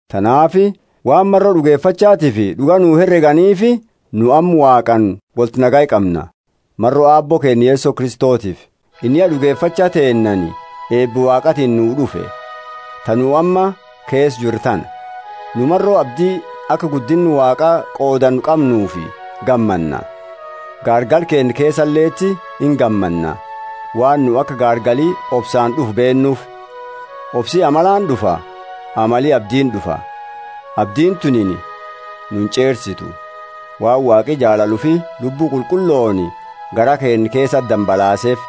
Tanaafi waan maro d'ugefachatifi d'uga nu hereganiifi nu amma Waaqaani wolti nagaya qamna, maro Aabbo keenna Yeso Kristotiifi. Inni ya d'ugefacha teennaani, eeba Waaqaatiini nuu d'ufe, ta nu amma keesa jiru tana. Nu maro abdi, aka guddinna Waaqa qoodannu qamnuufi gammanna! Gaargala keenna keesaleti ingammanna, waan nu aka gaargali obsaani d'ufu beennuufi; obsi amalani d'ufa, amali abdiini d'ufa. Abdiini tunini nu inch'eersitu, waan Waaqi jaalala ufi Lubbu Qulqullooni garaa keenna keesa dambalaaseefi.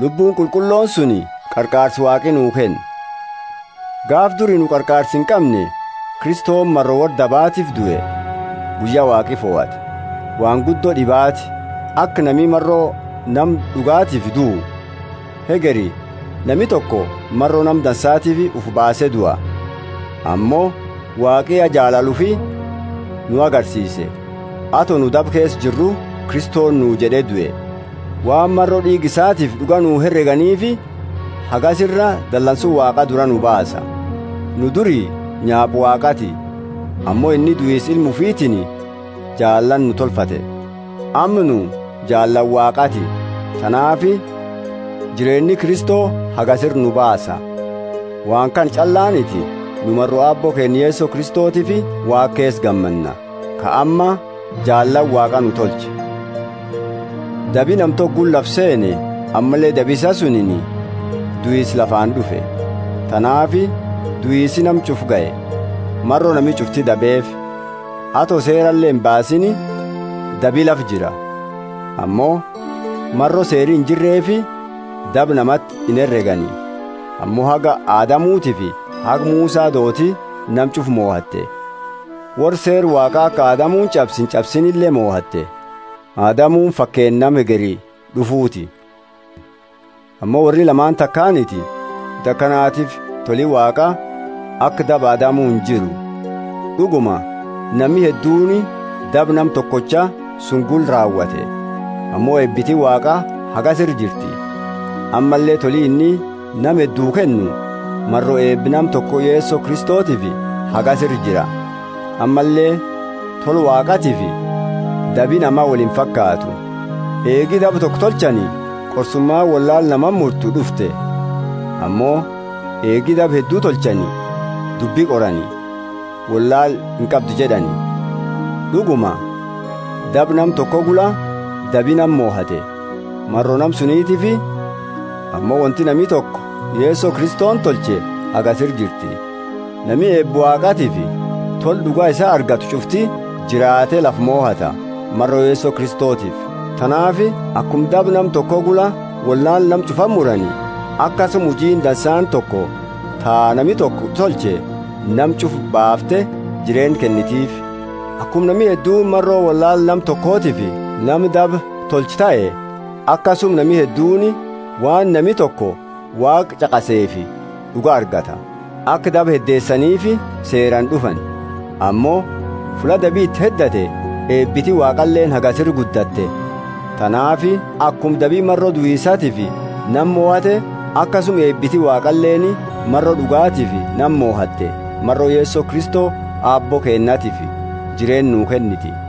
Lubbuuni Qulqullooni suni qarqaarsa Waaqi nuu kenne. Gaafa duri nu qarqaarsa inqamne, Kristoni maro worra dabaatiifi due, guyya Waaqi fohate. Waan guddo d'ibaati, aki nami maro nama d'ugatiifi duu. Hegeri nami toko maro nama dansaatiifi ufi baase dua. Ammo Waaqi ya jaalala ufi nu agarsiise; ato nu daba keesa jirru Kristoni nuu jed'e due! Waan maro d'iiga isaatiifi d'uga nu hereganiifi hagasi ira dalansu Waaqa dura nu baasa. Nu duri nyaapa Waaqaati, ammo inni duisa Ilma ufitiini jaalaani nu tolfate. Amma nu jaalaani Waaqaati, tanaafi jireenni Kristo hagasi ira nu baasa! Waan kana ch'allaaniti; nu maro Aabbo keenna Yeso Kristotiifi Waaqa keesa gammanna, ka amma jaalaani Waaqa nu tolche. Dabi nama toko gula lafa seene, ammalle dabi isaa suni duisa lafaani d'ufe. Tanaafi duisi nama ch'ufa gahe, maro nami ch'ufti dabeefi. Ato seerale imbaasiini dabi lafa jira, ammo maro seeri injirreefi daba namati inheregani. Ammo haga Adamutiifi haga Musa dooti nama ch'ufa mohate, worra seera Waaqa aka Adamuni ch'abse inch'absiinile mohate. Adamuni fakeenna nama hegeri d'ufuuti. Ammo worri lamaani takaaniti; wonti akanatiifi toli Waaqa aka daba Adamu injiru. D'uguma nami hedduuni daba nama tokocha suni gula raawate. Ammo eebiti Waaqa hagasi ira jirti, ammalle toli inni nama heddu kennu, maro eeba nama toko Yeso Kristotiifi, hagasi ira jira. Ammalle tola Waaqaatiifi dabi nama woli imfakaatu. Eegi daba toko tolchani qorsumaani wollaala namati murtu d'ufte; ammo eegi daba heddu tolchani, dubbi qorani, wollaala inqabdu jed'ani. D'uguma daba nama toko gula dabi nama mohate, maro nama sunitiifi, Ammo wonti nami toko Yeso Kristoni tolche hagasi ira jirti! Nami eeba Waaqaatiifi tola d'uga isaa argatu ch'ufti jiraate lafa mohata, maro Yeso Kristotiifi. Tanaafi akuma daba nama toko gula wollaala nama ch'ufati murani, akasuma hujiini dansaani toko, ta nami toko tolche, nama ch'ufa baafte jireenna kennitiifi. Akuma nami hedduuni maro wollaala nama tokotiifi nama daba tolchu tahe, akasuma nami hedduuni waan nami toko Waaqa ch'aqaseefi d'uga argata. Aka daba heddeesaniifi Seeraani d'ufani, ammo fulla dabi iti heddate eebiti Waaqaleeni hagasi ira guddatte. Tanaafi akuma dabi maro duisatiifi nama mohate, akasuma eebiti Waaqaleeni maro d'ugatiifi nama mohatte maro Yeso Kristo Aabbo keennatiifi jireenna nuu kenniti.